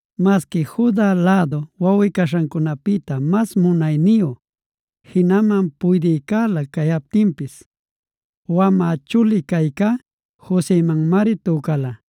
Masqui Juda lluy wawꞌi-caśhancunapïta mas munayniyu, jinaman puydïcälä cayaptinpis,b wamä chuli caycá Josemanmari tücala.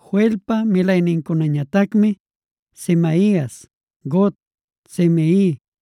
Joelpa milaynincunañatacmi: Semaias, Gog, Simei,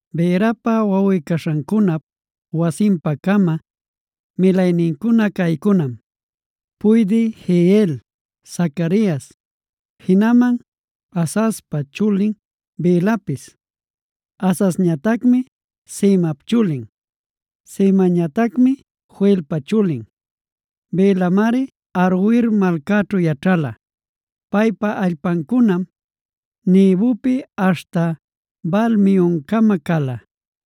Beerapa wawꞌi-caśhancunap wasinpa-cama milaynincuna caycunam: Puydï Jeiel, Zacarias, jinaman Azazpa chulin Belapis. Azazñatacmi Semap chulin. Semañatacmi Joelpa chulin. Belamari Aroer malcaćhu yaćhala; paypa allpancunam Nebopi aśhta Baal-meoncama cala.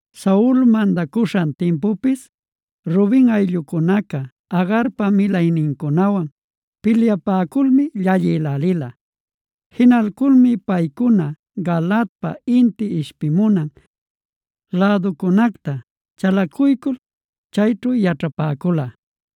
Saul mandacuśhan timpupis Ruben ayllucunaca Agarpa milaynincunawan pilyapäculmi llallïlälila. Jinalculmi paycuna Galaadpa inti ishpimunan läducunacta chalacuycul chayćhu yaćhapäcula.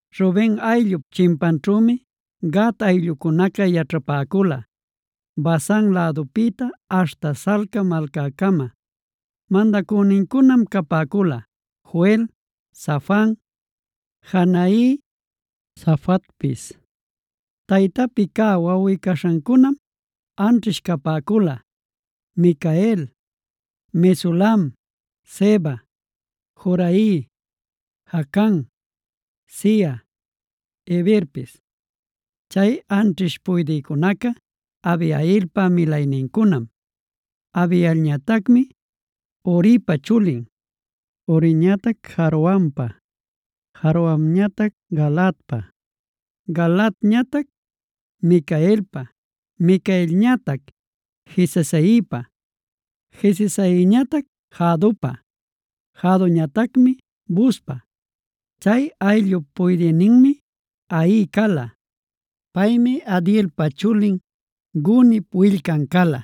Ruben ayllup chimpanćhümi Gad ayllucunaca yaćhapäcula, Basan lädupïta aśhta Salca malcäcama. Mandacünincunam capäcula: Joel, Safan, Jaanai, Safatpis. Taytapi cä wawꞌi-caśhancunam anćhish capäcula: Micael, Mesulam, Seba, Jorai, Jacan, Zia, Heberpis. Chay anćhish puydïcunaca Abihailpa milaynincunam. Abihailñatacmi Huripa chulin, Huriñatac Jaroanpa, Jaroanñatac Galaadpa, Galaadñatac Micaelpa, Micaelñatac Jesisaipa, Jesisaiñatac Jahdopa, Jahdoñatacmi Buzpa. Chay ayllup puydïninmi Ahi cala. Paymi Abdielpa chulin, Gunip willcan cala.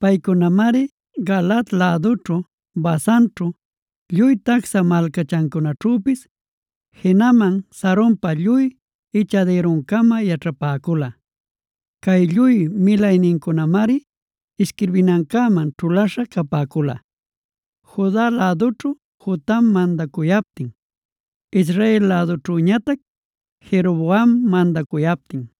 Paycunamari Galaad lädućhu, Basanćhu, lluy tacsha malcachancunaćhüpis, jinaman Saronpa lluy ichadïruncama yaćhapäcula. Cay lluy milaynincunamari isquirbinancäman ćhulaśha capäcula, Juda lädućhu Jotam mandacuyaptin, Israel lädućhüñatac Jeroboam mandacuyaptin.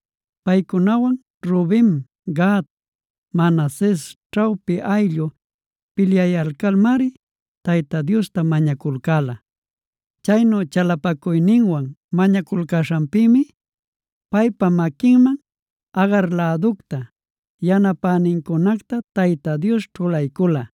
Paycunawan Ruben, Gad, Manases ćhawpi ayllu pilyayalcalmari Tayta Diosta mañaculcäla. Chaynu chalapacuyninwan mañaculcäśhanpïmi paypa maquinman Agar läducta, yanapänincunacta Tayta Dios ćhulaycula.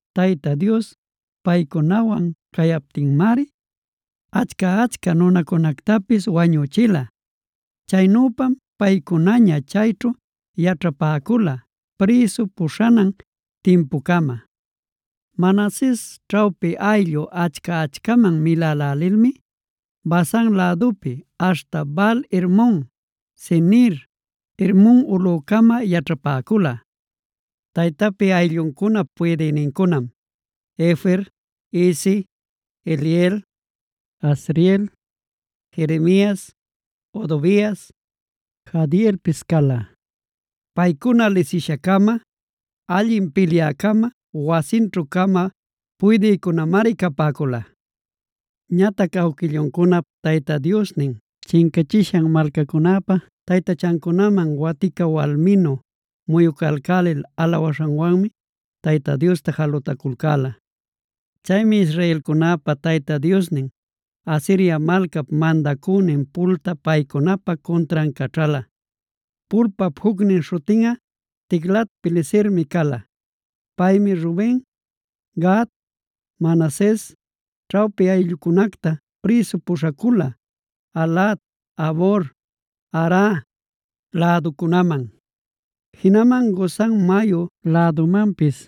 Tayta Dios paycunawan cayaptinmari achca-achca nunacunactapis wañüchila. Chaynüpam paycunaña chayćhu yaćhapäcula prïsu puśhanan timpucama. Manases ćhawpi ayllu achca-achcaman milälälilmi Basan lädupi aśhta Baal-hermon, Senir, Hermon ulꞌucama yaćhapäcula. Taytapi aylluncunap puydïnincunam: Efer, Isi, Eliel, Azriel, Jeremias, Hodovias, Jahdielpis cala. Paycuna lisisha-cama, allin pilyä-cama, wasinćhu-cama puydïnincunamari capäcula. Ñatac awquilluncunap Tayta Diosnin chincachishan malcacunäpa taytachancunaman watica walminu muyucalcälil alawaśhanwanmi Tayta Diosta jalutaculcäla. Chaymi israelcunäpa Tayta Diosnin, Asiria malcap mandacünin Pultad paycunapa cuntran caćhäla. Pulpap jucnin śhutinꞌa Tiglat-pilesermie cala. Paymi Ruben, Gad, Manases ćhawpi ayllucunacta prïsu puśhacula Halah, Habor, Hara, läducunaman, jinaman Gozan mayu lädumanpis.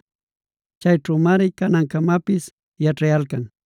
Chayćhümari canancamapis yaćhayalcan.